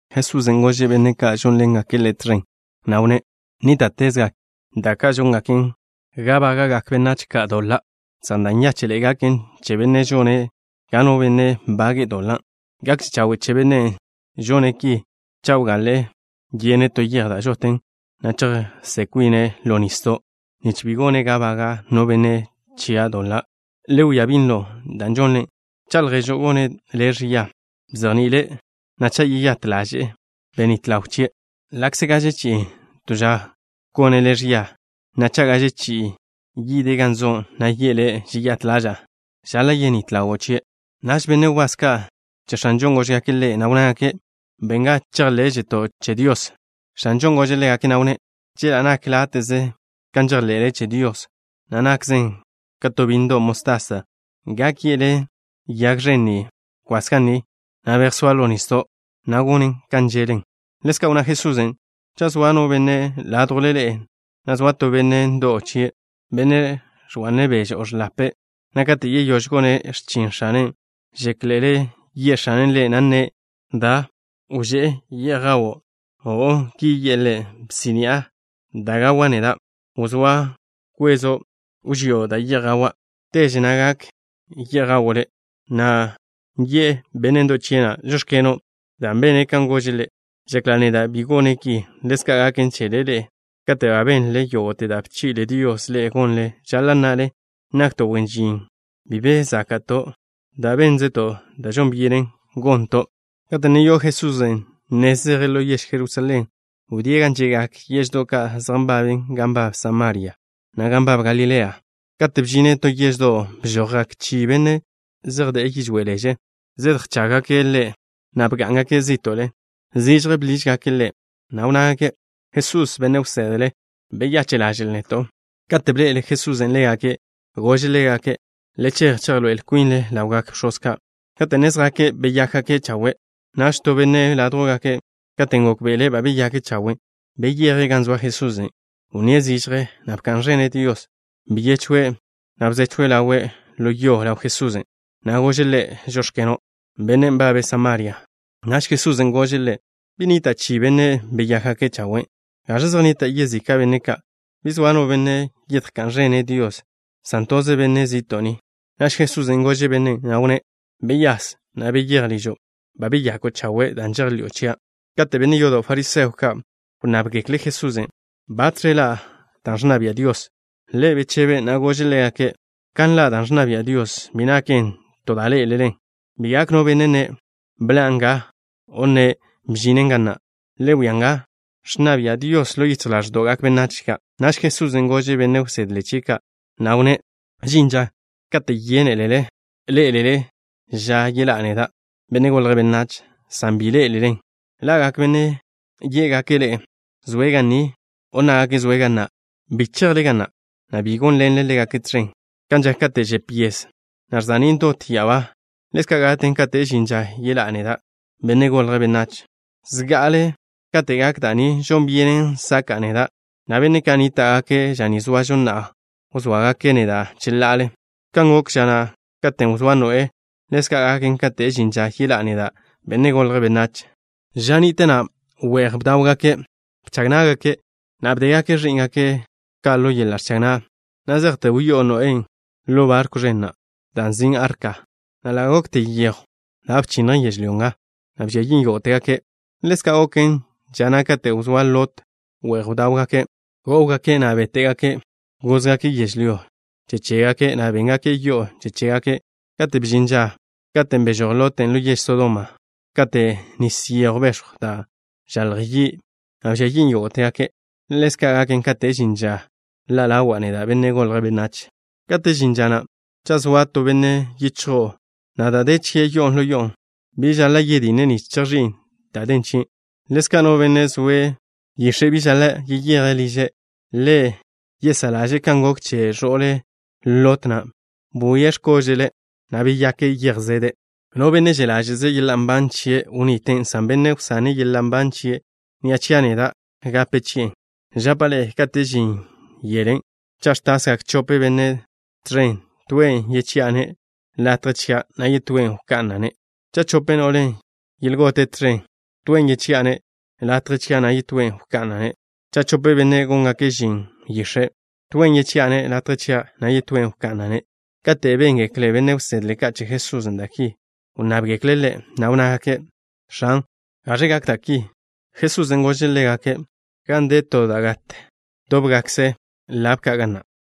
Jesusen' gože' benne' ka' žónḻengake' Ḻe' tẕen, na' wnné': —Nníta'tezgak da' ka' žóngaken ga bága'gak benách ka' doḻa', san da' nyáche'ḻe'e gaken che bennen' žone' ga no benne' bage'e doḻa'. Gakže chawe' che bennen' žone' ki cha' wgaḻa' yene' to yej da' žot, na' chejžó'n kwine' ḻo nisdo', nich bi gone' ga baga' no benne' chia' doḻa'. Le wia binlo da' žonle. Cha' lježo' gone' le' ẕia, bzejni'ile', na' cha' yeyát ḻaže'e, benít ḻaw chie'. Ḻa'kze gaže chi'i to ža gone' le' ẕia, na' cha' gaže chi'i yide' gan zo', na' yi'e le': “Žeyát ḻaža'a” žaḻa' yenít ḻawo' chie'. Naž benne' wbás ka' che X̱anžon' góžgake' Ḻe', na' wnnágake': —Ben ga chejḻé'žeto' che Dios. X̱anžon' gože' ḻégake', na' wnné': —Chela' nak láte'ze kan žejḻe'le che Dios, na' nakzen ka to bínnedo' mostasa, gak ye'le yag ẕen ni: “Kwas ga ni, na' bejsóa ḻo nisdo'” na' gonen kan že'len. Ḻezka' wnná Jesusen': —Cha' zoa no benne' ládjwle ḻe'e, na' zoa to benne' ndo'w chie', benne' ẕga'ne' beže o ẕḻape', na' kate' yeyóž gone' x̱chin x̱ane', ¿žéklele ye' x̱ane' ḻe', na' nne': “Da, wžé' ye'j gawo'”? O'o. Ki yi'e ḻe': “Bsí'ni'a da' gawa' neda'. Wzóa kwezo' wžío' da' ye'j gawa'. Teže na' gak ye'j gawo' le'.” ¿Yi'e benne' ndo'w chie' na': “Žóx̱keno'” dan' bene' kan gože' ḻe'? Žekla' neda', bi gone' ki. Ḻezka' gaken chele ḻe'e. Kate' ba benle yógo'te da' bchi'le Dios ḻe'e gonle, žaḻa' nnale: “Nakto' wen žin bi be záka'to', dan' bénzeto' da' žon byenen gonto'.” Kate' ne yo'o Jesusen' nez zeje' ḻo yež Jerusalén, wdíe' gan že'gak yeždo' ka' zej nbaben gan nbab Samaria, na' gan nbab Galilea. Kate' bžine' to yeždo', bžojgak chi benne' zej de'e yižwé' leže zedjchággake' Ḻe', na' bgá'ngake' zí'to'le. Zižje bḻížgake' Ḻe', na' wnnágake': —Jesús, benne' wsedle, beyache' ḻaže'l neto'. Kate' bḻe'el Jesusen' ḻégake', gože' ḻégake': —Le chej, chejḻoé'el kwinle ḻawgak bx̱oz ka'. Kate' ne zjake', beyákgake' chawe'. Naž to benne' ládjwgake', katen' gókbe'ele' ba beyake' chawe', beyeje' gan zoa Jesusen'. Wnníe' zižje, na' bka'n ẕene' Dios. Byechwe', na' bzechw ḻawe' ḻo yo ḻaw Jesusen', na' gože' Ḻe': “Žóx̱keno'.” Bennen' nbabe' Samaria. Naž Jesusen' gože' ḻe': —¿Bi nnita' chi benne' beyákgake' chawe'? ¿Gaẕe zej nnita' yezika' benne' ka'? ¿Bi zoa no benne' yedjká'n ẕene' Dios, san toze benne' zi'to' ni? Naž Jesusen' gože' bennen', na' wnné': —Beyase, na' beyéj ližo'. Ba beyako' chawe' dan' žejḻi'o chia'. Kate' benne' yodo' fariseo ka' wnnábgekle' Jesusen' batẕe ḻa' dan' ẕnna bia' Dios, Ḻe' bechebe', na' gože' ḻégake': —Kan ḻa' dan' ẕnna bia' Dios, bi naken to da' ḻé'elelen. Bi gak no benne' nne': “Bḻan' nga” o nne': “Bžinen ga na'.” Le wia nga. Ẕnna bia' Dios ḻo yichj ḻáẕdo'gak benách ka'. Naž Jesusen' gože' benne' wsedle chie' ka', na' wnné': —Žin ža kate' yénelele ḻé'elele ža yeḻá'a neda', Benne' Golje' Benách, san bi ḻé'elelen. Ḻa'gak benne' yé'gake' ḻe'e: “Zoe' ga ni” o nnágake': “Zoe' ga na'.” Bi chejle ga na', na' bi gónḻenle ḻégake' tẕen. Kan žak kate' žep yes, na' ẕza'nín' dot ya'abá, ḻezka' gaken kate' žin ža yeḻá'a neda', Benne' Golje' Benách. Zga'ale kate' gak da' ni, žon byenen saka'a neda', na' benne' ka' nníta'gake' ža ni zoažo na'a wzóagake' neda' cheḻa'ale. Kan gok ža na' katen' wzóa Noé, ḻezka' gaken kate' žin ža yeḻá'a neda', Benne' Golje' Benách. Ža ni'te na' we'j bdáwgake'. Bchag ná'gake', na' bdégake' ẕí'ngake' ka' ḻo yeḻa' ẕchag na', na' zejte wyó'o Noé na' ḻo barkw ẕen na' da' nzin' arka, na' ḻa' gokte yejw da' bchinnjen yežlyó nga, na' bžia yin' yógo'tegake'. Ḻezka' goken ža na' katen' wzóa Lot. We'j bdáwgake'. Gó'wgake', na' béte'gake'. Gózgake' yežlyó che chégake', na' béngake' yo'o che chégake'. Kate' bžin ža na' katen' bežój Lot na' ḻo yež Sodoma, ka to nis yejw bex̱jw da' ẕzalj yi', na' bžia yin' yógo'tegake'. Ḻezka' gaken kate' žin ža ḻa' ḻawa' neda', Benne' Golje' Benách. ’Kate' žin ža na', cha' zoa to benne' yichjo'o, na' da' de chie' yo'on ḻo yo'on', bi žaḻa' yetje' nich chejx̱i'e dan' den chie'. Ḻezka' no benne' zoe' yix̱e' bi žaḻa' yeyeje' liže'. Le yesá' ḻaže' kan gok che ẕo'le Lot na', bwie' x̱kóže'le', na' beyake' yej zede'. No benne' že' ḻáže'ze' yeḻa' nban chie', wniten', san bennen' wsane' yeḻa' nban chie' ni'a chia' neda', gape chi'en'. ’Žapa' ḻe'e: kate' žin yelen', cha' ẕtasgak chope benne' tẕen, toen' yechi'a-ne' latje chia', na' yetóen' wka'na'-ne'. Cha' chope no'le yelgote' tẕen, toen' yechi'a-ne' latje chia', na' yetóen' wka'na'-ne'. Cha' chope benne' góngake' žin yix̱e', toen' yechi'a-ne' latje chia', na' yetóen' wka'na'-ne'. Kate' béngekle benne' wsedle ka' che Jesusen' da' ki, wnnábgekle' Ḻe', na' wnnágake': —X̱an, ¿gaẕ gak da' ki? Jesusen' gože' ḻégake': —Gan de to da' gat, dóbgakkze lab ka' ga na'.